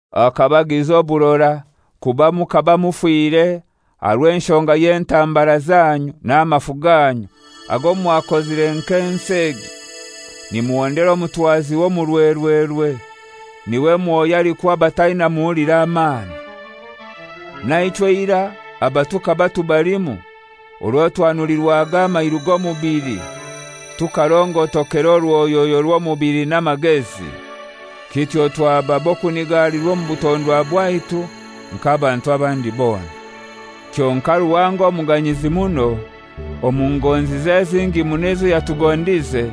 Akabagiza oburora, kuba mukaba mufire aha rw'enshonga y'entambara zanyu n'amafu ganyu ago mwakozire nk'ensi egi, nimuhondera omutwazi w'omu rwerwerwe, n'iwe mwoyo alikuha abataina muhuliro amani. Naichwe eirai aba tukaba tubalimu orwo twanulirwaga amairu g'omubili, tukarongotokera orwoyoyo rw'omubili n'amagezi, kityo twaba b'okunigalirwa omu butondwa bwaitu, nk'abantu abandi bona. Kyonkai Ruhanga omuganyizi muno, omu ngonzize ezingi muno ezo yatugondize,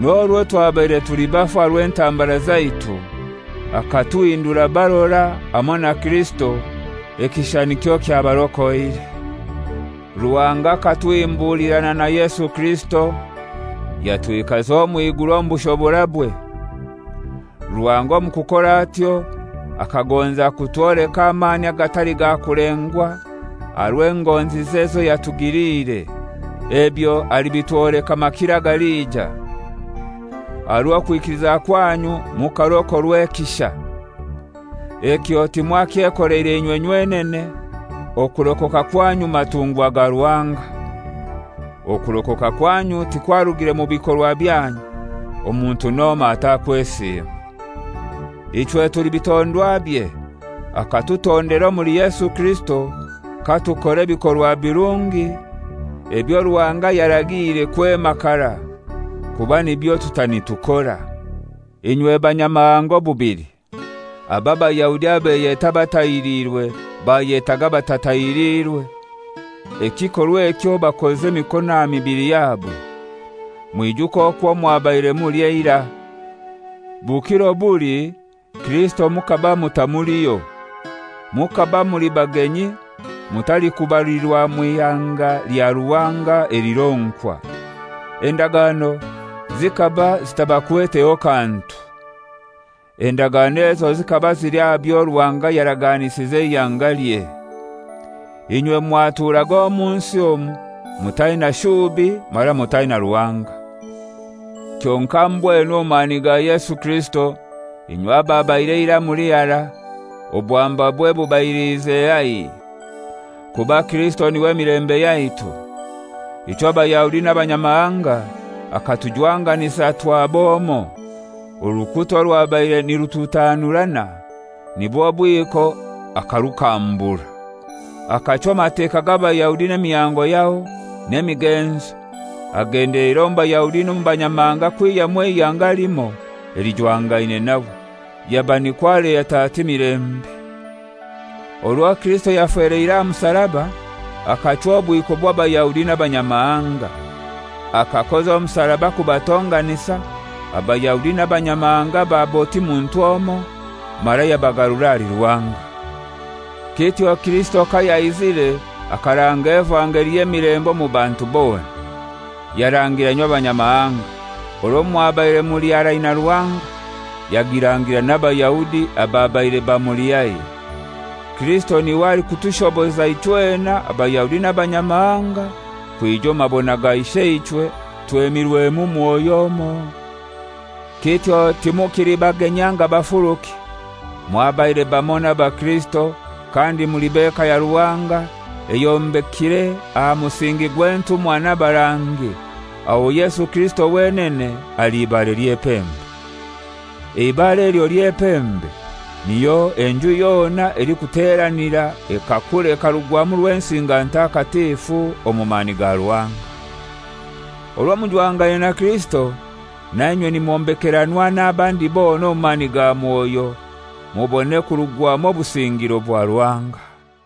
n'orwo twabaire tuli bafu aha rw'entambara zaitu, akatuhindura barora hamoi na Kirisito, ekisha nikyo kyabarokoire. Ruhanga akatuhimbulirana na Yesu Kirisito yatwikaza omw'iguru omu bushoborabwe. Ruhanga omu kukora atyo akagonza kutwoleka amani agatali ga kulengwa aha rw'engonzize ezo yatugiliire. Ebyo alibitwoleka makiro agalija. Aha rw'okwikiliza kwanyu mukarokorwa ekisha. Ekyo timwakyekoleire inywe nywenene; okurokoka kwanyu matungwa ga Ruhanga. Okurokoka kwanyu tikwarugire mu bikorwa byanyu, omuntu n'omoi atakwesiima. Ichwe tuli bitondwabye, akatutondera omuli Yesu Kirisito katukora ebikorwa birungi, ebyo Ruhanga yaragiire kwema karai, kuba nibyo tuta nitukora. Omujwangano omuli Kirisito Inywe Banyamahanga obubili, abo Abayahudi abeyeta abatahiriirwe bayetaga «Abatatahiliirwe» (ekikorwa ekyo bakoza emikono aha mibili yabo) mwijuke okwo mwabaire muli eirai. Bukiro buli Kirisito mukaba mutamuliho. Mukaba muli bagenyi, mutalikubalirwa mw'ihanga lya Ruhanga elironkwa. Endagano zikaba zitabakweteho kantu. Endagano ezo zikaba zili aha byo Ruhanga yaraganisize eihangalye. Inywe mwaturaga omu nsi omu mutaina shubi mara mutaina Ruhanga. Kyonkai mbwenu omu mani ga Yesu Kirisito inywe ababaire eirai muli harai, obwambabwe bubailiize haihi. Kuba Kirisito n'iwe mirembe yaitu. Ichwe Abayahudi n'Abanyamahanga akatujwanganisa twaba omoi. Orukuta orwabaire nirututanurana, nibwo bwiko, akarukambura. Akachwa Amateka g'Abayahudi n'emihango yaho, n'emigenzo, agendeleire omu Bayahudi n'omu Banyamahanga kwihyamu eihanga limoi elijwangaine nawe, yaba nikwo aleta atyo emilembe. Orwo Kirisito yafeleire aha musaraba akachwa obwiko bw'Abayahudi n'Abanyamahanga. Akakoza omusaraba kubatonganisa, Abayahudi n'Abanyamahanga baba oti muntu omoi, mara yabagarura ahali Ruhanga. Kityo Kirisito kayaizire akaranga evangeli y'emilembe omu bantu bona. Yarangira inywe Abanyamahanga, orwo mwabaire muli harai na Ruhanga, yagirangira n'Abaayahudi ababaire bamuli haihi. Kirisito n'iwe alikutushoboza ichwena, Abayahudi n'Abanyamahanga kwija omu mabona ga Isheichwe twemirwemu Mwoyo omoi. Kityo timukili bagenyi anga bafuruki; mwabaire bamoi n'abakirisito kandi muli b'eka ya Ruhanga, eyombekire aha musingi gw'entumwa n'abarangi, aho Yesu Kirisito wenene ali ibare ly'epembe. Eibare elyo ly'epembe niho enju yona elikuteranira ekakura ekarugwamu Rwensinga Ntakatifu omu mani ga Ruhanga. Orwo mujwangaine na Kirisito nainywe nimwombekeranwa n'abandi bona omu mani ga Mwoyo mubone kurugwamu obusingiro bwa Ruhanga.